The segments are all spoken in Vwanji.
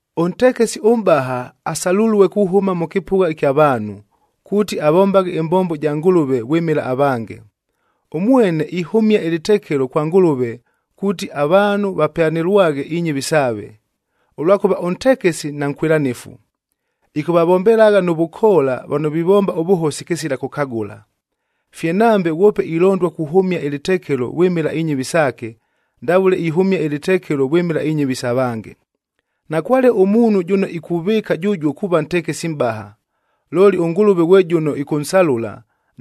Ʉntekesi ʉmʼbaha asalulue kuhʉma mʉ kɨpʉgha ɨkya vaanhu, kuuti avombaghe ɨmbombo ja Ngʉlʉve vwɨmɨla avange. Ʉmwene ihʉmia ɨlɨtekelo kwa Ngʉlʉve kuuti avaanhu vapyanɨlwaghe inyɨvi saave. Ʉlwakʉva ʉntekesi nankwɨlanɨfu, ɨkʉvavombelagha nʉ vʉkoola vano vivomba ʉvʉhosi kɨsila kʉkagʉla. Fye nambe ghwope ilondua kuhʉmia ɨlɨtekelo vwɨmɨla inyɨvi saake, ndavʉle ihʉmia ɨlɨtekelo vwɨmɨla inyɨvi isa vange. Nakwale ʉmuunhu jʉno ikuvɨɨka jʉjuo kuuva ntekesi mʼbaha, looli ʉNgʉlʉve ghwe jʉno ɨkʉnsalʉla,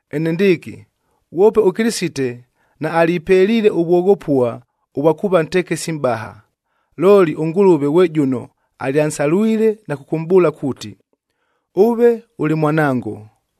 Enendɨɨkɨ ghwope ʉKɨlɨsite naalipeliile ʉvwoghopua ʉvwa kuuva ntekesi mʼbaha, looli ʉNgʉlʉve ghwe jʉno alyansalwile na kʉkʉmʼbʉʉla kuuti, “Ʉve ʉlɨ Mwanango,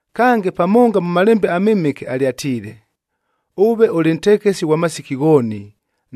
Kange, pamonga mʉ Malembe aMɨmɨke, alyatiile, “Ʉve ʉlɨ ntekesi ghwa masiki ghooni,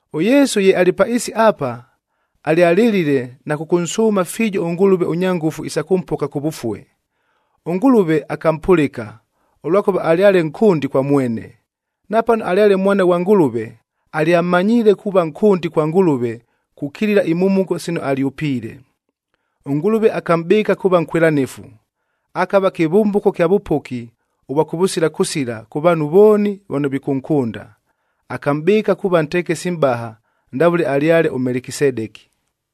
ɄYesu ye alɨ pa ɨɨsi apa, alyalɨlile na kʉkʉnsʉʉma fiijo ʉNgʉlʉve ʉnya ngʉfu isa kʉmpoka kʉvʉfue.d ɄNgʉlʉve akampʉlɨka, ʉlwakʉva alyale nkʉndi kwa mwene. Napano alyale Mwana ghwa Ngʉlʉve, alyamanyiile kuuva nkʉndi kwa Ngʉlʉve kukilila imhumuko sino alyʉpiile. ɄNgʉlʉve akamʼbɨɨka kuuva nkwɨlanɨfu, akava kɨvʉmbʉko kya vʉpoki ʉvwa kʉvʉsila kʉsila kʉ vaanhu vooni vano vikʉnkʉnda. Akamʼbɨɨka kuuva ntekesi mʼbaha ndavʉle alyale ʉMelekisedeki.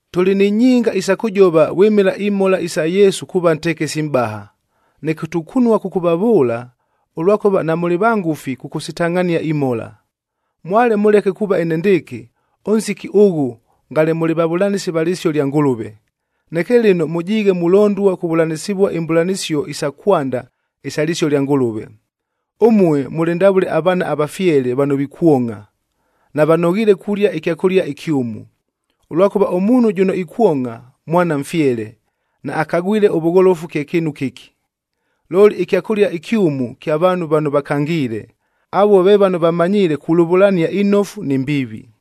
Tʉlɨ ni nyinga isa kʉjova vwɨmɨla imhola isa Yesu kuuva ntekesi mʼbaha, neke tukunua kʉkʉvavʉʉla, ʉlwakʉva namʉlɨ vangʉfi kʉkʉsitangʼhania imhola. Mwale mʉleke kuuva enendɨɨkɨ, ʉnsiki ʉghʉ ngale mʉlɨ vavʉlanɨsi va lɨsio lya Ngʉlʉve. Neke lɨno mʉjiighe mulondua kuvʉlanɨsɨvua imbʉlanɨsio isa kwanda isa lɨsio lya Ngʉlʉve. Ʉmue mʉlɨ ndavʉle avaana avafyele vano vikwongʼha, navanoghiile kulia ɨkyakʉlia ɨkyʉmu. Ʉlwakʉva ʉmuunhu jʉno ikwongʼha, mwana mfyele, naakagwile ʉvʉgholofu kye kɨɨnu kɨki. Looli ɨkyakʉlia ɨkyʉmu kya vaanhu vano vakangiile, avuo ve vano vamanyiile kulʉvʉlania inofu ni mbiivi.